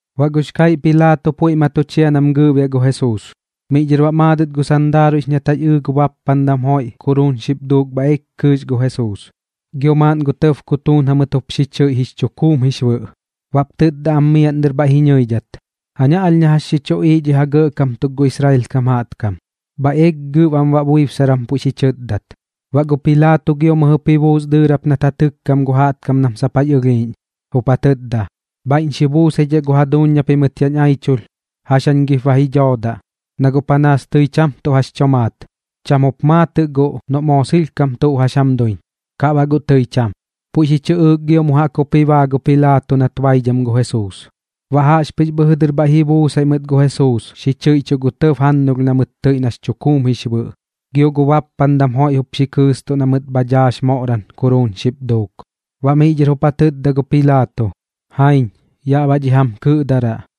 Baꞌ gux kaiꞌ Pilaato puiꞌ ma tu chia nam gɨɨꞌbiaꞌ gu Jesuus. Miꞌ dhɨr baꞌ maadɨt gu sandaaruiꞌx nat jax ɨɨ gu bappandam joiꞌ kuruun xip duuk bhaiꞌ eek kɨɨx gu Jesuus, gio maaꞌn gu tɇb kutuun jamɨt jup xi chɨiꞌ jix chukuum jix bɨꞌ. Baꞌp tɨtda am miaꞌn dɨr bhaiꞌ ji ñɨidhat: ―Jaña alh na jax xi chuꞌiiꞌ dhi ja gɇꞌkam tuk gu Israel kam jaꞌtkam. Bhaiꞌ eeg gɨb am baꞌ buibsaram puiꞌ xi chɨtdat. Baꞌ gu Pilaato gio mɨjɨp ji buus dɨɨrap nat ja tɨkkam gu jaꞌtkam nam sap jax ɨlhiiꞌñ, jup ja tɨtda: ―Bhaiꞌñ xi buusaidhaꞌ gu jaduuñ na pimɨt yaꞌñ aichulh. ¿Jax jañ gip ba ji dhoodaꞌ? Na guꞌ panaas tɨi cham tuꞌ jax tomaat. Cham jup maatɨꞌ guꞌ noꞌ moo sɨlhkam tuꞌ jax jam duiñ, kaꞌ baꞌ guꞌ tɨi cham. Puiꞌ xi chɨꞌɨɨk gio mu jaꞌk jup ji baa gu Pilaato nat baidham gu Jesuus. Baꞌ jaꞌxpɨx bhɨjɨ dɨr bhaiꞌ ji buusaiꞌ mɨt gu Jesuus xi chɨiꞌchuꞌ gu tɇb jannulh na mɨt tɨiꞌ nax chukuum jix bɨꞌ, gio gu bappandam joiꞌ jup xi kɨɨstuꞌ na mɨt bha dhaax moꞌram kuruun xip duuk. Baꞌ miꞌ dhɨr jup ja tɨtda gu Pilaato: ―Jaiñ, yaꞌ baꞌ dhi jam kɨꞌdaraꞌ.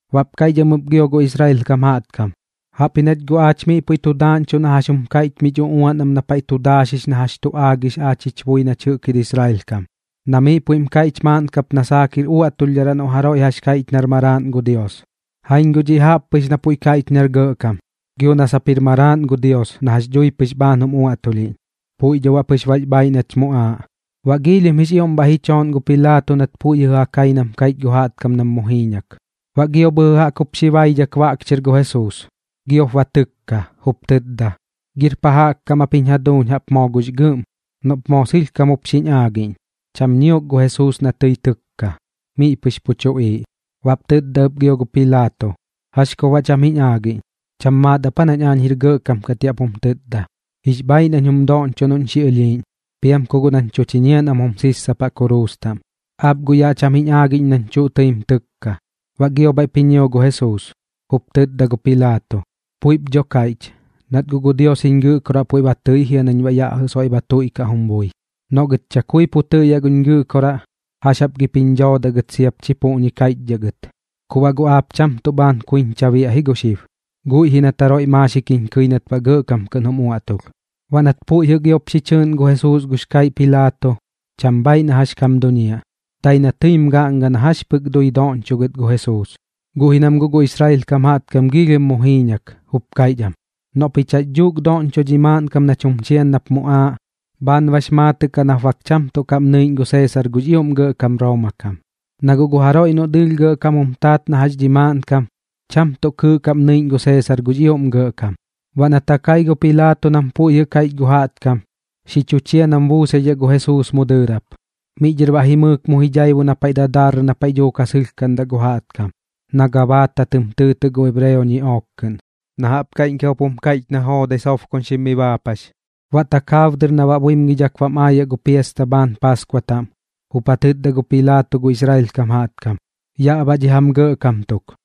Baꞌp kaiꞌch am ɨp gio gu Israel kam jaꞌtkam: ―Jaꞌpji nach guꞌ aach miꞌ puiꞌ tu daaꞌñchuꞌ na jax jum kaiꞌch mich uꞌuan am na paiꞌ tu daaxix na jax tu aagix aach jich bui nach jɨꞌk jir Israel kam. Na miꞌ paiꞌ puiꞌm kaiꞌch maaꞌn kap na saak jir uaꞌtulhdharaꞌ noꞌ jaroiꞌ jax kaiꞌch nar maraaꞌn gu Dios. Jaiñ guꞌ dhiꞌ jaꞌp pɨx na puiꞌ kaiꞌch nar gɇꞌkam, gio na sap jir maraaꞌn gu Dios na jax dhui pɨx bhaan jum uaꞌtulhiꞌñ. Puiꞌ dho baꞌ pɨx bax bhaiꞌ nach muꞌaaꞌ. Baꞌ giilhim jix ioꞌm bhaiꞌ ji chooꞌn gu Pilaato nat puiꞌ jɨꞌ ja kai nam kaiꞌch gu jaꞌtkam nam mu jiiñak. Baꞌ gio bhɨjɨ jaꞌk jup xi baidhak baꞌk chɨr gu Jesuus, gio baꞌp ba tɨkka, jup tɨtda: ―¿Gir pa jaꞌk kam aap jiñ jaduuñ jaꞌp moo gux gɨꞌm? Noꞌp moo sɨlhkam jup xiñ aagiꞌñ. Cham ñiok gu Jesuus na tɨi tɨkka. Miꞌ pɨx pu tuꞌiiꞌ. Baꞌp tɨtda ɨp gio gu Pilaato: ―¿Jax kup baꞌ cham jiñ aagiꞌñ? ¿Cham maat ap aa nañ aañ jir gɇꞌkam kat yaꞌ pum tɨtda? Jix bhaiꞌ nañ jum doꞌñchoꞌ noꞌñ xi ɨlhiiꞌñ, piam ku guꞌ nañ tu chiñiaꞌ nam jum sissapaꞌ kuruus taꞌm. Aap guꞌ yaꞌ cham jiñ aagiꞌñ nañ tuꞌ tɨim tɨkka. Baꞌ gio bhaiꞌp ji ñio gu Jesuus, jup tɨtda gu Pilaato: ―Puiꞌp dho kaiꞌch, nat guꞌ gu Dios jiñ Gɨꞌkoraꞌ puiꞌ ba tɨi jia nañ baꞌ yaꞌ jɨꞌ soiꞌ ba tuiꞌkaꞌ jum bui. Noꞌ gɨt chakui pu tɨꞌyaꞌ guñ Gɨꞌkoraꞌ, ¿jax jap gip jiñ dhoodaꞌ gɨt siap chi puꞌñi kaiꞌchdhaꞌ gɨt? Ku baꞌ guꞌ aap cham tuꞌ bhaan kuiñcha biaꞌ ji gu xib, guiꞌ ji nat jaroiꞌ maaxik jiñ kɨi nat baꞌ gɇꞌkam kɨꞌn jum uaꞌtulh. Baꞌ nat puiꞌ jɨꞌ giop xi chɨɨꞌn gu Jesuus gux kaiꞌ Pilaato, cham bhaaiꞌ na jax kam duñiaꞌ, dai na tɨim gaꞌnga na jax pɨk dui doꞌñchoꞌ gɨt gu Jesuus. Guꞌ ji nam guꞌ gu Israel kam jaꞌtkam giilhim mu jiiñak, jup kaiꞌch am: ―Noꞌ pich jax dhuuk doꞌñcho dhi maaꞌnkam nach jum chian nap muꞌaaꞌ, bhaan bax maatɨꞌ kaꞌ nap bak cham tuꞌ kaꞌm nɨiꞌñ gu Seesar gux ioꞌm gɇꞌkam Rooma kam. Na guꞌ gu jaroiꞌ noꞌ dɨɨlh gɇꞌkam jum taat na jax dhi maaꞌnkam, cham tuꞌ kɨɨꞌ kaꞌm nɨiꞌñ gu Seesar gux ioꞌm gɇꞌkam. Baꞌ nat ja kai gu Pilaato nam puiꞌ jɨꞌ kaiꞌch gu jaꞌtkam, xi chu chia nam buusaidhaꞌ gu Jesuus mu dɨɨrap. Miꞌ dhɨr baꞌ jimɨɨk mu ji dhaibu na paiꞌ dadarrɨ na paiꞌ dhuuk ja sɨlhkaꞌndaꞌ gu jaꞌtkam, na Gabaata tɨm tɨɨtɨꞌ gu ebreo ñiꞌook kɨꞌn, na jaꞌp kaiꞌñkam jup jum kaiꞌch na joodai sobkoñxim mi baapax. Baꞌ takaab dɨr na baꞌ buimgidhak bam aayaꞌ gu piasta bhaan Paaskua taꞌm, jup ja tɨtda gu Pilaato gu Israel kam jaꞌtkam: ―Yaꞌ baꞌ dhi jam gɇꞌkam tuk.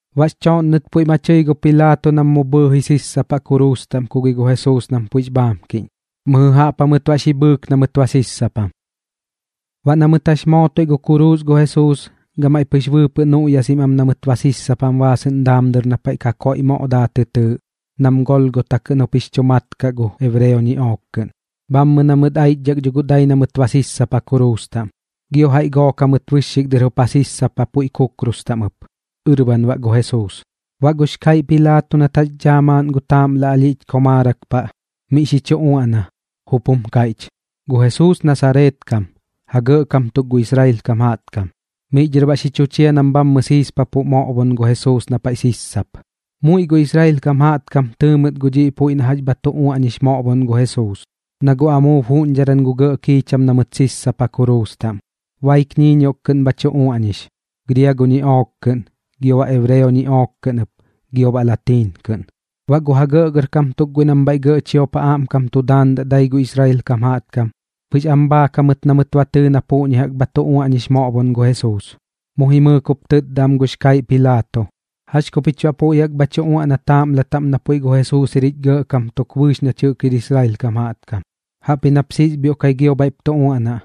Baꞌx chooꞌnnɨt puiꞌ ma tɨi gu Pilaato nam mu bhɨɨji sissapaꞌ kuruus taꞌm ku gi gu Jesuus nam puiꞌx bhaamkiꞌñ. Mɨjɨ jaꞌp jamɨt baꞌ xi bhɨɨk na mɨt ba sissapam. Baꞌ na mɨt jax mootoiꞌ gu kuruus gu Jesuus, gamaiꞌ pɨx bɨɨpɨꞌ nuꞌyasim am na mɨt ba sissapam baasɨꞌn daam dɨr na paiꞌ Kakoiꞌ Moꞌ Daa tɨ tɨɨꞌ, nam Golgota kɨꞌn jup jix chu mat kaꞌ gu ebreo ñiꞌook kɨꞌn. Bhammɨ na mɨt aichdhak dho guꞌ dai na mɨt ba sissapa kuruus taꞌm. Gio jaiꞌ gook jamɨt bɨxxik dɨr jup ja sissapa puiꞌ kukrus taꞌm ɨp, ɨrban baꞌ gu Jesuus. Baꞌ gux kaiꞌ Pilaato nat jax dhaa maaꞌn gu taaꞌmla alhiꞌch komaarak paꞌ, miꞌ xi chu uaꞌna, jup jum kaiꞌch: “Gu Jesuus Nasareet kam, ja gɇꞌkam tuk gu Israel kam jaꞌtkam.” Miꞌ dhɨr baꞌ xi chu chia nam bhammɨ siispapuꞌ moꞌbon gu Jesuus na paiꞌ sissap. Muiꞌ gu Israel kam jaꞌtkam tɨɨ mɨt gu dhiꞌ puiꞌ na jax bha tu uaꞌñix moꞌbon gu Jesuus, na guꞌ amuub juꞌñdharan gu gɇꞌ kiicham na mɨt sissapa kuruus taꞌm. Baik ñiiñioꞌk kɨꞌn bha tu uaꞌñix: Griago ñiꞌook kɨꞌn, gio baꞌ ebreo ñiꞌook kɨꞌn ɨp, gio baꞌ gu latiin kɨꞌn. Baꞌ gu ja gɇꞌgɇrkam tuk guiꞌ nam bhaiꞌ gɇꞌ chiop ja aꞌmkam tu daandaꞌ dai gu Israel kam jaꞌtkam, pɨx am bhaak jamɨt na mɨt ba tɨɨ na puꞌñi jaꞌk bha tu uaꞌñix moꞌbon gu Jesuus. Mu jimɨɨk jup tɨtda am gux kaiꞌ Pilaato: ―¿Jax ku pich baꞌ puiꞌ jaꞌk bha tu uaꞌna taaꞌmla taꞌm na puiꞌ gu Jesuus jir jich gɇꞌkam tuk bɨɨx nach jɨꞌk jir Israel kam jaꞌtkam? Jaꞌpji nap siisbhioꞌkai gio bhaiꞌp tu uaꞌnaꞌ,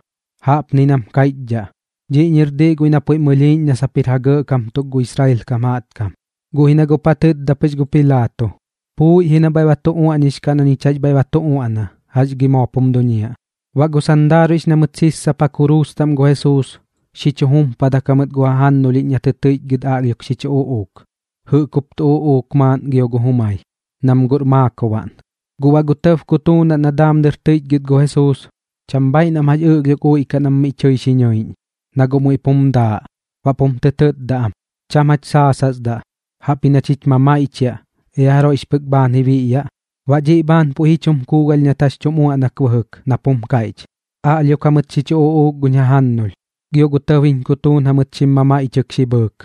jaꞌpni nam kaiꞌchdhaꞌ: “Dhiꞌñir diꞌ guiꞌ na puiꞌm ɨlhiiꞌñ na sap jir ja gɇꞌkam tuk gu Israel kam jaꞌtkam.” Guꞌ ji na guꞌp ja tɨtda pɨx gu Pilaato: ―Puuiꞌ ji na bhaiꞌ ba tu uaꞌñix kaꞌ na ñich jax bhaiꞌ ba tu uaꞌna. ¿Jax gi moop jum duñiaꞌ? Baꞌ gu sandaaruiꞌx na mɨt sissapa kuruus taꞌm gu Jesuus, xi chu jumpadak jamɨt gu jajannulhiꞌñ na tɨ tɨiꞌchgɨt aꞌlhiok xi chu uꞌuuk. Jɨꞌk jup tu uꞌuuk maaꞌn gio gu jumai, nam guꞌr maakobaꞌn. Guꞌ baꞌ gu tɇb kutuunaꞌn na daam dɨr tɨiꞌchgɨt gu Jesuus, cham bhaiꞌ nam jax ɨꞌlhiok uiꞌkaꞌ nam miꞌ tɨi xi nɨiꞌñ, na guꞌ muiꞌ pum daaꞌ. Baꞌp jum tɨ tɨtda am: ―Cham jach saasasdaꞌ, jaꞌpji nach jich mamaiꞌchiaꞌ, ea jaroiꞌx pɨk bhaan ji biꞌyaꞌ. Baꞌ dhiꞌ bhaan puiꞌ ji chum kuugalh nat jax tum uaꞌnak bɨjɨk nap jum kaiꞌch: “Aꞌlhiok jamɨt xi chu uꞌuuk guñ jajannulh, gio gu tɇb jiñ kutuun jamɨt xim mamaiꞌchɨk xi bhɨɨk.”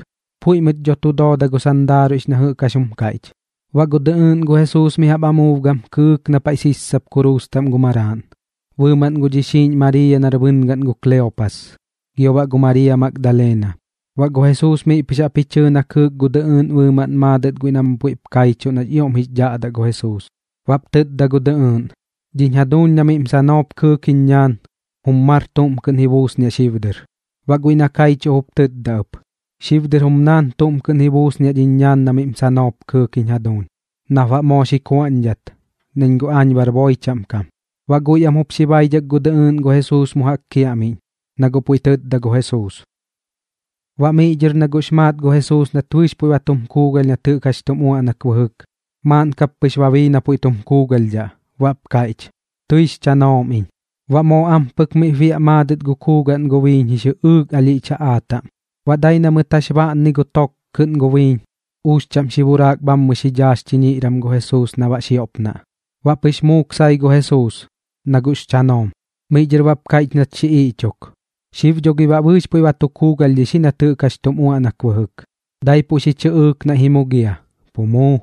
Puiꞌ mɨt dho tu dooda gu sandaaruiꞌx na jɨꞌk jax jum kaiꞌch. Baꞌ gu dɨꞌɨɨꞌn gu Jesuus mi jaꞌp amuub gam kɨɨk na paiꞌ sissap kuruus taꞌm gu maraaꞌn, bɨɨmaꞌn gu dhixiiꞌñ Mariiya nar bɨngaꞌn gu Kleopas, gio baꞌ gu Mariiya Magdalena. Baꞌ gu Jesuus miꞌ pɨx jaꞌp ji chɨɨ na kɨɨk gu dɨꞌɨɨꞌn bɨɨmaꞌn maadɨt guiꞌ nam puiꞌp kaichuꞌ nax ioꞌm jix dhaꞌdaꞌ gu Jesuus. Baꞌp tɨtda gu dɨꞌɨɨꞌn: ―Dhiñ jaduuñ na miꞌm sanoop kɨɨk jiñ ñaan, jum mar tuꞌm kɨꞌn ji buusniaꞌ xib dɨr. Baꞌ guiꞌ na kaichuꞌ jup tɨtda ɨp: ―Xib dɨr jum naan tuꞌm kɨꞌn ji buusniaꞌ dhiñ ñaan na miꞌm sanoop kɨɨk jiñ jaduuñ, nap baꞌ moo xi kuaꞌñdhat, nañ guꞌ aañ bar boi chaꞌm kam. Baꞌ guiꞌ am jup xi baidhak gu dɨꞌɨɨꞌn gu Jesuus mu jaꞌk kiaꞌmiꞌñ, na guꞌ puiꞌ tɨtda gu Jesuus. Baꞌ miꞌ dhɨr na guꞌx maat gu Jesuus nat bɨɨx puiꞌ ba tum kuugalh nat jɨꞌk jax tum uaꞌnak bɨjɨk, maaꞌn kap pɨx ba bii na puiꞌ tum kuugalhdhaꞌ, baꞌp kaiꞌch: ―Tɨix chanoom iñ. Baꞌ moo ampɨk miꞌp biaꞌ maadɨt gu kuugaꞌn gu biiñ jix jɨꞌɨɨk alhiꞌch jaꞌaa taꞌm. Baꞌ dai na mɨt jax baꞌnni gu tok kɨꞌn gu biiñ, uux chaꞌm xi buraak bhammɨ xi dhaax chiñiꞌram gu Jesuus na baꞌ xioꞌpnaꞌ. Baꞌ pɨx muuk sai gu Jesuus, na guꞌx chanoom. Miꞌ dhɨr baꞌp kaiꞌch nat xi iꞌchok: ―Xib dho gi baꞌ bɨɨx puiꞌ ba tu kuugalhdhix ji nat jɨꞌk jax tum uaꞌnak bɨjɨk. Daipuꞌ xi chɨꞌɨɨk naiꞌ ji mugia, pu muu.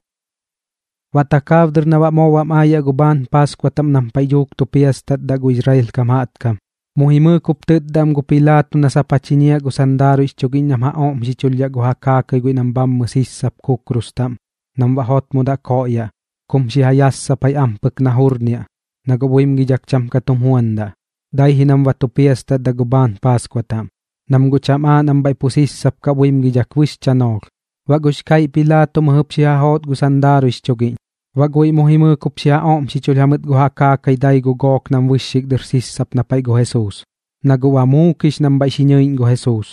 Baꞌ takaab dɨr na baꞌ moo bam aayaꞌ gu bhaan Paaskua taꞌm nam paiꞌ dhuuk tu piastatdaꞌ gu Israel kam jaꞌtkam, mu jimɨɨk jup tɨtda am gu Pilaato na sap ja chiñiaꞌ gu sandaaruiꞌx chugiꞌñ nam ja oꞌmxichulhdhaꞌ gu ja kaakai guiꞌ nam bhammɨ sissap kukrus taꞌm nam baꞌ jotmodaꞌ koꞌyaꞌ kum xi ja yassapai ampɨk na jurniaꞌ, na guꞌ buimgidhak cham ka tum juandaꞌ, dai ji nam ba tu piastatdaꞌ gu bhaan Paaskua taꞌm, nam guꞌ cham aaꞌ nam bhaiꞌ pu sissap kaꞌ buimgidhak bɨx chanoolh. Baꞌ gux kaiꞌ Pilaato mɨjɨp xi ja joot gu sandaaruiꞌx chugiꞌñ, baꞌ guiꞌ mu jimɨɨk jup ja oꞌmxichulh jamɨt gu ja kaakai dai gu gook nam bɨxxik dɨr sissap na paiꞌ gu Jesuus. Na guꞌ ba muukix nam bhaiꞌ xi ñɨiꞌñ gu Jesuus,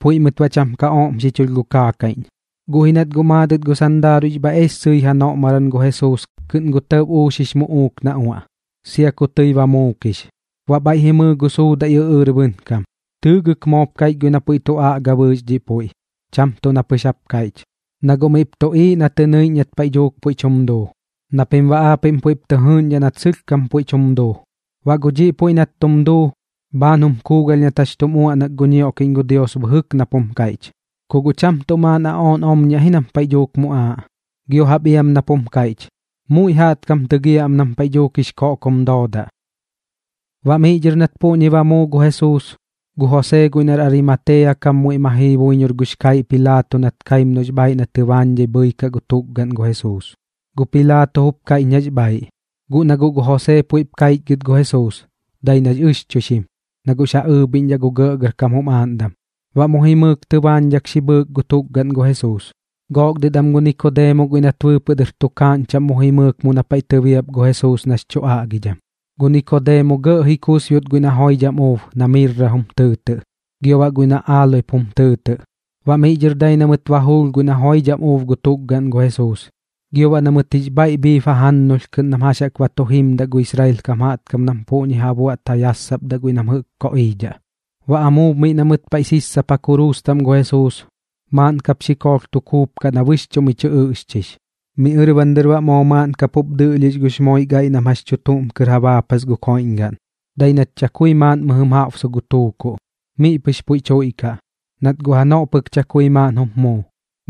puiꞌ mɨt baꞌ cham ka oꞌmxichulh gu kaakaiꞌñ. Guꞌ ji nat guꞌ maadɨt gu sandaaruiꞌx bhaiꞌ ees sɨi janoꞌmaram gu Jesuus kɨꞌn gu tɇb uux jix muꞌuuk na uaꞌ, sia ku tɨi ba muukix. Baꞌ bhaiꞌ ji mɨɨ gu suudaiꞌ ɨꞌɨɨr bɨnkam. Tɨɨgɨk moop kaiꞌch guiꞌ na puiꞌ tu aꞌga bɨɨx dhiꞌ puiꞌ, cham tuꞌ na pɨx jap kaiꞌch, na guꞌ miꞌp tuꞌiiꞌ na tɨ nɨiꞌñ nat paiꞌ dhuuk puiꞌ tum duu, na pim baꞌ aapiꞌm puiꞌp tɨ jɨɨꞌñdhaꞌ nat sɨlhkam puiꞌ tum duu. Baꞌ gu dhiꞌ puiꞌ nat tum duu, bhaan jum kuugalh nat jax tum uaꞌnak gu ñioꞌkiꞌñ gu Dios bɨjɨk nap jum kaiꞌch: “Ku guꞌ cham tuꞌ maaꞌn aꞌooꞌn omñiaꞌ ji nam paiꞌ dhuuk muꞌaaꞌ.” Gio jaꞌp iam nap jum kaiꞌch: “Muiꞌ jaꞌtkam tɨgiaꞌ am nam paiꞌ dhuuk jix koꞌkom doodaꞌ.” Baꞌ miꞌ dhɨr nat puꞌñi ba muu gu Jesuus, gu Josee guiꞌ nar Arimatea kam muiꞌ ma jii buiñor gux kaiꞌ Pilaato nat kaim noꞌx bhaaiꞌ na tɨbaañdhai bhɨikaꞌ gu tukgaꞌn gu Jesuus. Gu Pilaato jup kaiꞌch nax bhaaiꞌ. Guꞌ na guꞌ gu Josee puiꞌp kaichgɨt gu Jesuus, dai nax ɨxchuixim, na guꞌx ja ɨɨbhiꞌñdhaꞌ gu gɇꞌgɇrkam jum aaꞌndam. Baꞌ mu jimɨɨk tɨbaañdhak xi bhɨɨk gu tukgaꞌn gu Jesuus. Gook dɨt am gu Nikodeemo guiꞌ nat bɨɨpɨꞌ dɨr tukaaꞌñ chaꞌm mu jimɨɨk mu na paiꞌ tɨbiap gu Jesuus nax chu aꞌgidham. Gu Nikodeemo gɇꞌ ji kusbiot guiꞌ na joidham uub na mirram tɨɨtɨꞌ gio baꞌ guiꞌ na aaloep jum tɨɨtɨꞌ. Baꞌ miꞌ dhɨr dai na mɨt ba juulh guiꞌ na joidham uub gu tukgaꞌn gu Jesuus, gio baꞌ na mɨt jix bhaiꞌ bhiib jajannulh kɨꞌn nam jax jaꞌk ba tu jimdaꞌ gu Israel kam jaꞌtkam nam puꞌñi jaꞌk ja buaꞌt ja yassapdaꞌ guiꞌ nam jɨꞌk koꞌiidhaꞌ. Baꞌ amuub miꞌ na mɨt paiꞌ sissapa kuruus taꞌm gu Jesuus, maaꞌn kap xikoolh tu kuup kaꞌ na bɨxchuꞌ miꞌ tɨ ɨꞌxchix. Miꞌ ɨrban dɨr baꞌ moo maaꞌn kap jup dɨꞌlhix gux moik aiꞌ nam jax chuutuꞌm kɨr ja baapas gu koiꞌñgaꞌn, dai nat chakui maaꞌn mɨjɨm jaꞌbsu gu tuukuꞌ, miꞌ pɨx puiꞌ tuiꞌkaꞌ, nat guꞌ janoꞌ pɨk chakui maaꞌn jup muu.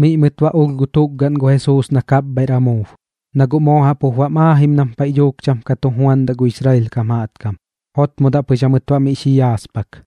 Miꞌ mɨt baꞌ ulh gu tukgaꞌn gu Jesuus na kapbhaiꞌr amuub, na guꞌ moo jaꞌp jup bam aajim nam paiꞌ dhuuk cham ka tu juandaꞌ gu Israel kam jaꞌtkam. Jotmodaꞌ pɨx jamɨt baꞌ miꞌ xi yaaspak.